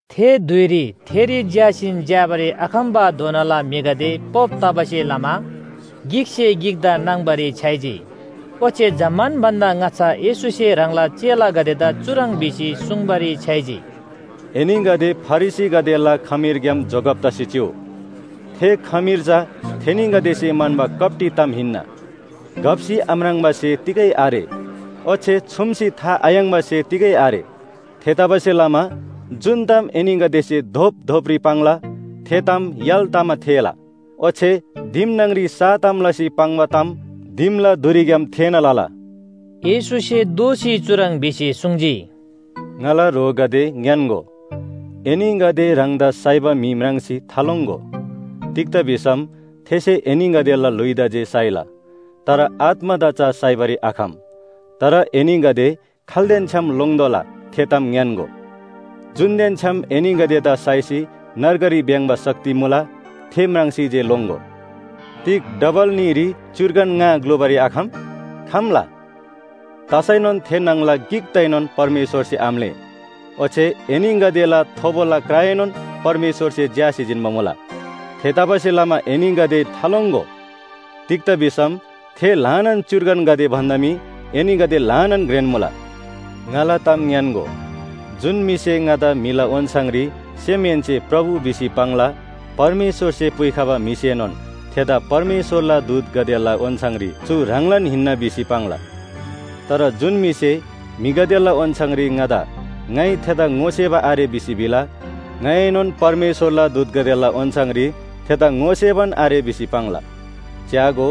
थे धुइरी थेरी झ्‍यासीन झ्‍याबारी आखम्‍बाधोनाला म्‍हिगदे पोप तबासे लमा गिकसे गिकदा नाङ्बारी छ्‌याइजी, ओच्‍छे जम्‍मान भन्‍दा ङाच्‍छा येशूसे ह्राङला चेलागदेदा चुह्रङ् भिसी सुङ्बारी छ्‌याइजी, “एनीगदे फरिसीगदेला खमीरग्‍याम जोगब तसी चिउ। थे खमीर चा थेनीगदेसे म्‍हन्‍बा कप्‍टी ताम हिन्‍ना। घप्‍सी आम्राङ्बा स्‍हे तिगै आरे, ओच्‍छे छुम्‍सी था आयाङ्बा स्‍हे तिगै आरे। थेतबासेलमा जुन ताम एनीगदेसे धोपधोपरी पाङ्ला थे ताम य्‍हाल तमा थेःला। ओच्‍छे दिम न्‍हङरी सा ताम लसी पाङ्बा ताम दिमला धुरीग्‍याम थेःना लला। येशूसे दोःसी चुह्रङ् भिसी सुङ्जी, “ङाला ह्रोगदे ङ्‌यान्‍गो, एनीगदे ह्राङदा साइबा म्‍हि म्राङ्सी थालोङ्‍गो। तिग्‍दा भिसम थेसे एनीगदेला ल्‍हुइदा जे साइला, तर आत्‍मादा चा साइबारी आखम। तर एनीगदे खाल्‍देन छ्‌याम लोङ्तोःला थे ताम ङ्‌यान्‍गो, जुनदेन छ्‌याम एनीगदेदा साइसी नर्गरी भ्‍याङ्‍बा शक्ति मुला, थे म्राङ्सी जे लोङ्‍गो। तिग डबल न्‍हीरी च्‍युर्गन ङा ग्‍लुबारी आखम? खम्‍ला। तसैनोन थे न्‍हङला गिकदाएनोन परमेश्‍वरसे आम्‍लेः। ओच्‍छे एनीगदेला थोबोला क्राएनोन परमेश्‍वरसे झ्‍यासी जिन्‍बा मुला। थेतबासेलमा एनीगदे थालोङ्‍गो। तिग्‍दा भिसम थे ल्‍हानान च्‍युर्गनगदे भन्‍दा मी एनीगदे ल्‍हानान घ्रेन मुला। “ङाला ताम ङ्‌यान्‍गो, जुन म्‍हिसे ङादा म्‍हिला ओन्‍छाङरी सेमहेन्‍से प्रभु भिसी पाङ्ला, परमेश्‍वरसे पुइखबा म्‍हिसेनोन थेदा परमेश्‍वरला दूतगदेला ओन्‍छाङरी चु ह्राङलान हिन्‍ना भिसी पाङ्ला। तर जुन म्‍हिसे म्‍हिगदेला ओन्‍छाङरी ङादा ङाइ थेदा ङोसेबा आरे भिसी भिला, ङाइएनोन परमेश्‍वरला दूतगदेला ओन्‍छाङरी थेदा सेबान आरे भिसी पाङ्ला। च्‍यागो,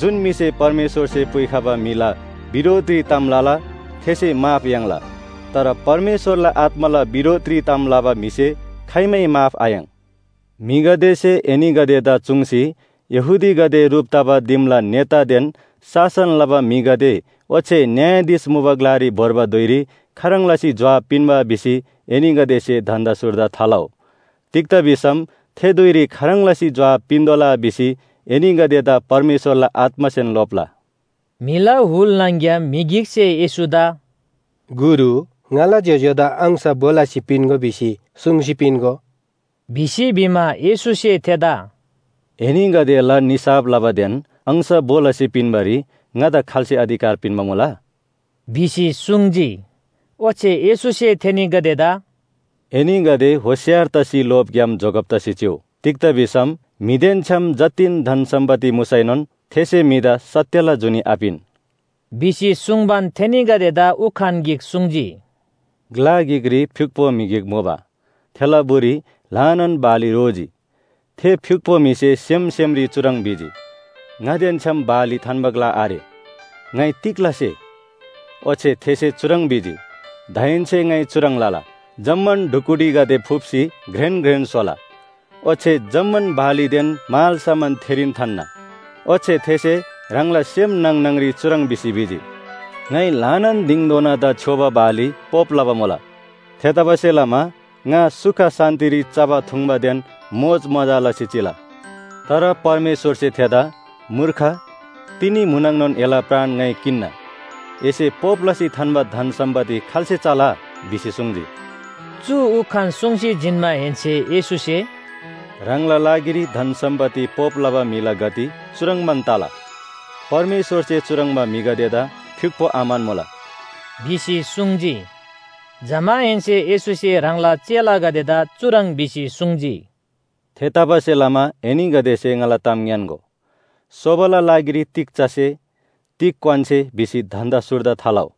जुन म्‍हिसे परमेश्‍वरसे पुइखबा म्‍हिला बिरोधरी ताम लला, थेसे माफ याङ्ला। तर परमेश्‍वरला आत्‍माला बिरोधरी ताम लबा म्‍हिसे खाइमै माफ आयाङ्। “म्‍हिगदेसे एनीगदेदा चुङ्सी यहूदीगदे ह्रुप तबा दिमला नेतादेन शासन लबा म्‍हिगदे ओच्‍छे न्‍यायाधीश मुबा ग्‍लारी भोर्बा धुइरी खाह्रङ् लसी जोहाब पिन्‍बा भिसी एनीगदेसे धन्‍दा सुर्दा थालउ। तिग्‍दा भिसम थे धुइरी खाह्रङ् लसी जोहाब पिन्‍तोःला भिसी एनीगदेदा परमेश्‍वरला आत्‍मासेन लोप्‍ला।” म्‍हिला हुल न्‍हङ‍ग्‍याम म्‍हि गिकसे येशूदा “गुरु, ङाला ज्‍योज्‍योदा अंश भो लसी पिन्‍गो भिसी सुङ्सी पिन्‍गो” भिसी भिमा, येशूसे थेदा “एनीगदेला निसाफ लबादेन अंश भो लसी पिन्‍बारी ङादा खाल्‍से अधिकार पिन्‍बा मुला” भिसी सुङ्जी। ओच्‍छे येशूसे थेनीगदेदा “एनीगदे होशियार तसी लोभग्‍याम जोगब तसी चिउ। तिग्‍दा भिसम म्‍हिदेन छ्‌याम जतिन धन सम्‍पत्ति मुसैनोन थेसे म्‍हिदा सत्‍यला जुनी आपिन” भिसी सुङ्बान, थेनीगदेदा उखान गिक सुङ्जी, “ग्‍ला गिकरी फ्‍युक्‍पो म्‍हि गिक मुबा, थेला बुरी ल्‍हानान बाली रोजी। थे फ्‍युक्‍पो म्‍हिसे सेम सेमरी चुह्रङ् भिजी, ‘ङादेन छ्‌याम बाली थान्‍बा ग्‍ला आरे, ङाइ तिग लसे?’ ओच्‍छे थेसे चुह्रङ् भिजी, ‘दाहेन्‍से ङाइ चुह्रङ् लला, जम्‍मान ढुकुटीगदे फुप्‍सी घ्रेन घ्रेन स्‍होला, ओच्‍छे जम्‍मान बालीदेन मालसामान थेरीन थान्‍ना। ओच्‍छे थेसे ह्राङला सेम न्‍हङ न्‍हङरी चुह्रङ् भिसी भिजी, “ङाइ ल्‍हानान दिङधोनादा छ्‌योबा बाली पोप लबा मुला। थेतबासेलमा ङा सुख शान्‍तिरी चबा थुङ्बादेन मोजमजा लसी चिला।” “तर परमेश्‍वरसे थेदा ‘मूर्ख, तिनी म्‍हुनङनोन एला प्राण ङाइ किन्‍ना, एसे पोप लसी थान्‍बा धन सम्‍पत्ति खाल्‍से चला?’ भिसी सुङ्जी।” चु उखान सुङ्सी जिन्‍माहेन्‍से येशूसे “ह्राङला लागिरी धन सम्‍पत्ति पोप लबा म्‍हिला गति चुह्रङ्बान तला। परमेश्‍वरसे चुह्रङ्बा म्‍हिगदेदा फ्‍युक्‍पो आम्‍हन्‍मुला” भिसी सुङ्जी। जमाहेन्‍से येशूसे ह्राङला चेलागदेदा चुह्रङ् भिसी सुङ्जी, “थेतबासेलमा एनीगदेसे ङाला ताम ङ्‌यान्‍गो, ‘सोबाला लागिरी तिग चसे, तिग क्‍वान्‍से भिसी धन्‍दा सुर्दा थालउ।’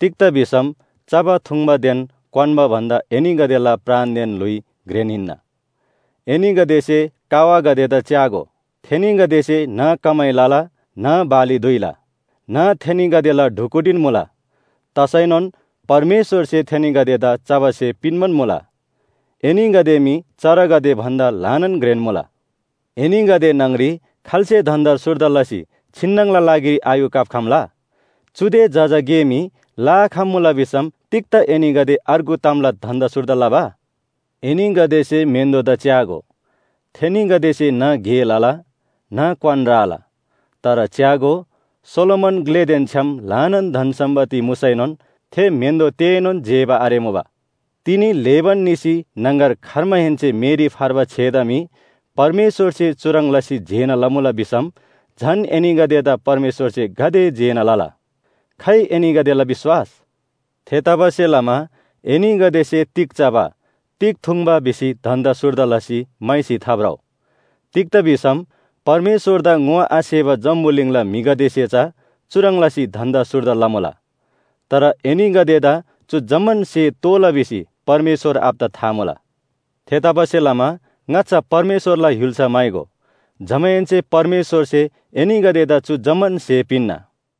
तिग्‍दा भिसम चबा थुङ्बादेन क्‍वान्‍बा भन्‍दा एनीगदेला प्राणदेन ल्‍हुइ घ्रेन हिन्‍ना। एनीगदेसे कावागदेदा च्‍यागो! थेनीगदेसे न्‍ह कमाइ लला, न्‍ह बाली धुइला, न्‍ह थेनीगदेला ढुकुटीन मुला। तसैनोन परमेश्‍वरसे थेनीगदेदा चबा स्‍हे पिन्‍बान मुला। एनीगदे मी चरागदे भन्‍दा ल्‍हानान घ्रेन मुला। एनीगदे न्‍हङरी खाल्‍से धन्‍दा सुर्दा लसी छिन्‍नङला लागिरी आयू काप्‍खम्‍ला? चुदे जजा गे मी लआखम्‍मुला भिसम तिग्‍दा एनीगदे अर्गु तामला धन्‍दा सुर्दा लबा? “एनीगदेसे म्‍हेन्‍दोदा च्‍यागो, थेनीगदेसे न्‍ह गे लला, न्‍ह क्‍वान राला। तर च्‍यागो, सोलोमन ग्‍लेदेन छ्‌याम ल्‍हानान धन सम्‍पत्ति मुसैनोन थे म्‍हेन्‍दो तेएनोन जेबा आरेमुबा। तिनी ल्‍हेबान निसी न्‍हङगर खर्माहेन्‍से मेरी फर्बा छेदा मी परमेश्‍वरसे चुह्रङ् लसी जेना लमुला भिसम झन एनीगदेदा परमेश्‍वरसे गाते जेना लला? खाइ एनीगदेला विश्‍वास? थेतबासेलमा एनीगदेसे तिग चबा, तिग थुङ्बा भिसी धन्‍दा सुर्दा लसी म्‍हाइसी थाभ्रउ। तिग्‍दा भिसम परमेश्‍वरदा ङोआसेबा जम्‍बुलिङला म्‍हिगदेसे चा चुह्रङ् लसी धन्‍दा सुर्दा लमुला। तर एनीगदेदा चु जम्‍मान स्‍हे तोःला भिसी परमेश्‍वर आबादा था मुला। थेतबासेलमा ङाच्‍छा परमेश्‍वरला य्‍हुल्‍सा म्‍हाइगो। जमाहेन्‍से परमेश्‍वरसे एनीगदेदा चु जम्‍मान स्‍हे पिन्‍ना।”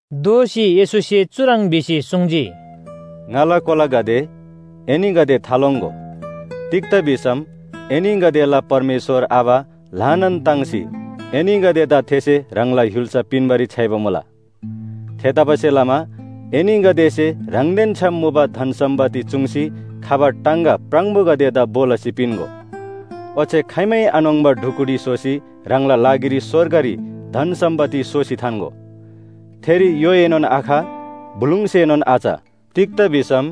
दोःसी येशूसे चुह्रङ् भिसी सुङ्जी, “ङाला कोलागदे, एनीगदे थालोङ्‍गो! तिग्‍दा भिसम एनीगदेला परमेश्‍वर आबा ल्‍हानान ताङ्सी एनीगदेदा थेसे ह्राङला य्‍हुल्‍सा पिन्‍बारी छ्‌याइबा मुला। थेतबासेलमा एनीगदेसे ह्राङदेन छ्‌याम मुबा धन सम्‍पत्ति चूङ्सी खबा टाङगा प्राङबोगदेदा भो लसी पिन्‍गो। ओच्‍छे खाइमै आन्‍होङ्बा ढुकुटी स्‍होसी ह्राङला लागिरी स्‍वर्गरी धन सम्‍पत्ति सोसी थान्‍गो। थेरी य्‍होएनोन आख, बुलुङसेनोन आच। तिग्‍दा भिसम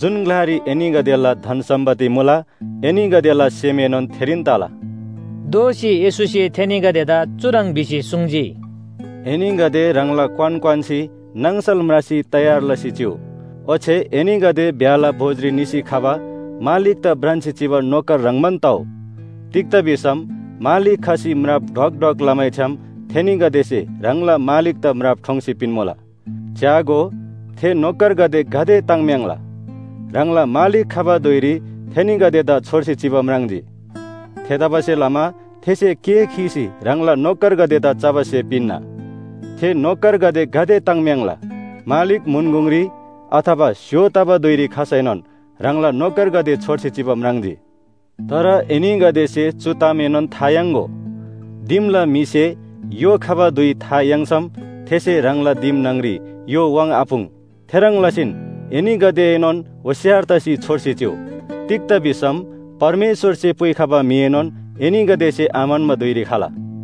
जुन ग्‍लारी एनीगदेला धन सम्‍पत्ति मुला, एनीगदेला सेमएनोन थेरीन तला।” दोःसी येशूसे थेनीगदेदा चुह्रङ् भिसी सुङ्जी, “एनीगदे ह्राङला क्‍वान क्‍वान्‍सी नाङसल म्रासी तयार लसी चिउ। ओच्‍छे एनीगदे ब्‍याहला भोजरी निसी खबा मालिकदा भ्रान्‍सी चिबा नोकर ह्रङ्‌बान तउ। तिग्‍दा भिसम मालिक खसी म्राप ढ्वक ढ्वक लमैछ्‌याम थेनीगदेसे ह्राङला मालिकदा म्राप ठोङ्सी पिन्‍मुला। च्‍यागो, थे नोकरगदे गाते ताङ्‍म्‍याङ्‍ला, ह्राङला मालिक खबा धुइरी थेनीगदेदा छोर्सी चिबा म्राङ्जी। थेतबासेलमा थेसे केः खीसी ह्राङला नोकरगदेदा चबा स्‍हे पिन्‍ना। थे नोकरगदे गाते ताङ्‍म्‍याङ्‍ला, मालिक म्‍हुन गुङरी अथवा स्‍य्‍हो तबा धुइरी खसैनोन ह्राङला नोकरगदे छोर्सी चिबा म्राङ्जी। तर एनीगदेसे चु तामएनोन था याङ्‍गो, दिमला म्‍हिसे य्‍हो खबा धुइ था याङ्सम थेसे ह्राङला दिम न्‍हङरी य्‍हो वाङ्आपुङ्। थेह्रङ् लसीन एनीगदेएनोन होशियार तसी छोर्सी चिउ। तिग्‍दा भिसम परमेश्‍वरसे पुइखबा म्‍हिएनोन एनीगदेसे आम्‍हन्‍बा धुइरी खला।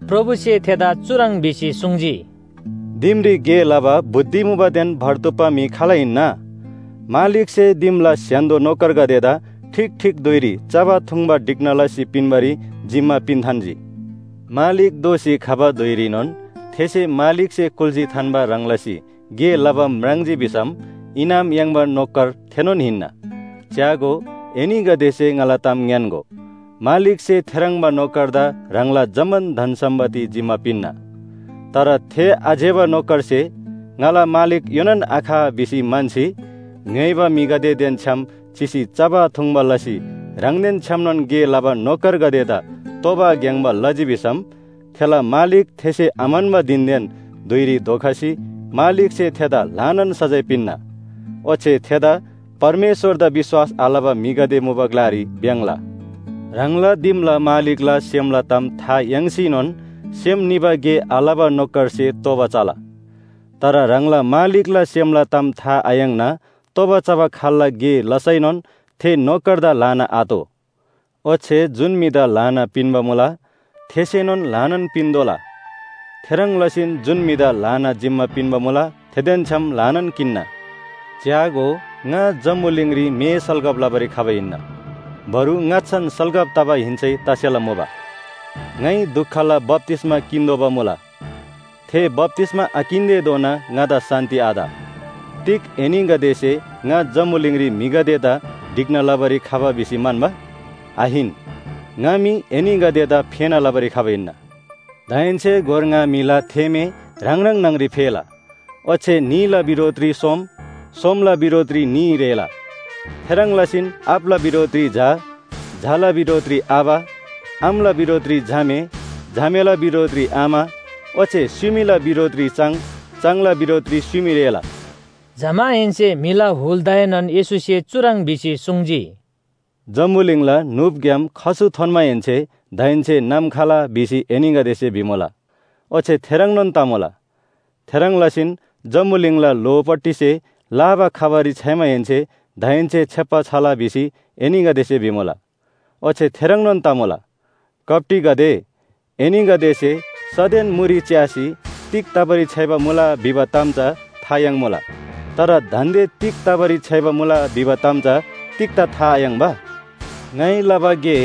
प्रभुसे थेदा चुह्रङ् भिसी सुङ्जी, “दिमरी गे लबा बुद्धि मुबादेन भर्तुप्‍पा म्‍हि खाल हिन्‍ना? मालिकसे दिमला स्‍य्‍हान्‍दो नोकरगदेदा ठीक ठीक धुइरी चबा थुङ्बा ढिक्‍ना लसी पिन्‍बारी जिम्‍मा पिन्‍थान्‍जी।” मालिक दोःसी खबा धुइरीनोन थेसे मालिकसे कुल्‍सी थान्‍बा ह्रङ् लसी गे लबा म्राङ्जी भिसम इनाम याङ्बा नोकर थेनोन हिन्‍ना। च्‍यागो, एनीगदेसे ङाला ताम ङ्‌यान्‍गो, मालिकसे थेह्रङ्बा नोकरदा ह्राङला जम्‍मान धन सम्‍पत्ति जिम्‍मा पिन्‍ना। तर थे आज्‍यबा नोकरसे ‘ङाला मालिक योनान आख’ भिसी म्‍हन्‍सी, ङ्‍य्‍होइबा म्‍हिगदेदेन छ्‌याम चिसी चबा थुङ्बा लसी ह्राङदेन छ्‌यामनोन गे लबा नोकरगदेदा तोबा ग्‍याङ्‍बा लजी भिसम, थेला मालिक थेसे आम्‍हन्‍बा धिनदेन धुइरी धोखसी मालिकसे थेदा ल्‍हानान सजाय पिन्‍ना। ओच्‍छे थेदा परमेश्‍वरदा विश्‍वास आलबा म्‍हिगदे मुबा ग्‍लारी भ्‍याङ्‍ला। “ह्राङला दिमला मालिकला सेमला ताम था याङ्सीनोन सेम निबा गे आलबा नोकरसे तोबा चला। तर ह्राङला मालिकला सेमला ताम था आयाङ्ना तोबा चबा खाल्‍ला गे लसैनोन थे नोकरदा ल्‍हाना आतोः। ओच्‍छे जुन म्‍हिदा ल्‍हाना पिन्‍बा मुला थेसेनोन ल्‍हानान पिन्‍तोःला। थेह्रङ् लसीन जुन म्‍हिदा ल्‍हानान जिम्‍मा पिन्‍बा मुला थेदेन छ्‌याम ल्‍हानान किन्‍ना। “च्‍यागो, ङा जम्‍बुलिङरी मे सल्‍कब लबारी खबा हिन्‍ना। बरु ङाच्‍छान सल्‍कब तबा हिन्‍सै तसेला मुबा। ङाइ दुखला बप्‍तिस्‍मा किन्‍तोःबा मुला, थे बप्‍तिस्‍मा आकिन्‍तेधोना ङादा शान्‍ति आत। तिग एनीगदेसे ङा जम्‍बुलिङरी म्‍हिगदेदा ढिक्‍ना लबारी खबा भिसी म्‍हन्‍बा? आहिन, ङा मी एनीगदेदा फेना लबारी खबा हिन्‍ना। दाहेन्‍से गोर ङा म्‍हिला थेमे ह्राङ ह्राङ न्‍हङरी फेला। ओच्‍छे न्‍हीला बिरोधरी सोम, सोमला बिरोधरी न्‍ही रेःला। थेह्रङ् लसीन आबाला बिरोधरी झा, झाला बिरोधरी आबा, आमाला बिरोधरी झामे, झामेला बिरोधरी आमा ओच्‍छे स्‍युमीला बिरोधरी चाङ, चाङला बिरोधरी स्‍युमी रेःला।” जमाहेन्‍से म्‍हिला हुलदाएनोन येशूसे चुह्रङ् भिसी सुङ्जी, “जम्‍बुलिङला न्‍हुपग्‍याम खसु थोन्‍माहेन्‍से ‘दाहेन्‍से नाम खला’ भिसी एनीगदेसे भिमुला, ओच्‍छे थेह्रङ्नोन तमुला। थेह्रङ् लसीन जम्‍बुलिङला ल्‍होपट्टिसे लाबा खबारी छ्‌याइमाहेन्‍से ‘दाहेन्‍से छेप्‍बा छला’ भिसी एनीगदेसे भिमुला, ओच्‍छे थेह्रङ्नोन तमुला। कप्‍टीगदे, एनीगदेसे सदेन मुरी च्‍यासी तिग तबारी छ्‌याइबा मुला भिबा ताम चा था याङ्मुला। तर दान्‍दे तिग तबारी छ्‌याइबा मुला भिबा ताम चा तिग्‍दा था आयाङ्बा? “‘ङाइ लबा गे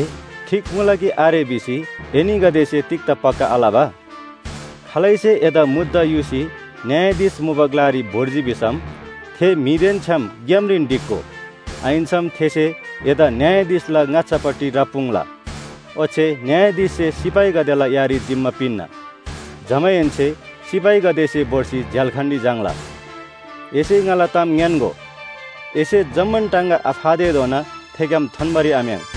ठीक मुला कि आरे’ भिसी एनीगदेसे तिग्‍दा पक्‍का आलबा? खालैसे एदा मुद्दा युसी न्‍यायाधीश मुबा ग्‍लारी भोर्जी भिसम, थे म्‍हिदेन छ्‌याम ग्‍यामरीन ढिक्‍गो। आहिन्‍सम थेसे एदा न्‍यायाधीशला ङाच्‍छापट्टि राप्‍पुङ्ला। ओच्‍छे न्‍यायाधीशसे सिपाहीगदेला यारी जिम्‍मा पिन्‍ना। जमाहेन्‍से सिपाहीगदेसे भोर्सी झ्‍याल्‍खानरी झाङ्‌ला। एसे ङाला ताम ङ्‌यान्‍गो, एसे जम्‍मान टाङगा आफातेधोना थेग्‍याम थोन्‍बारी आम्‍याङ्।”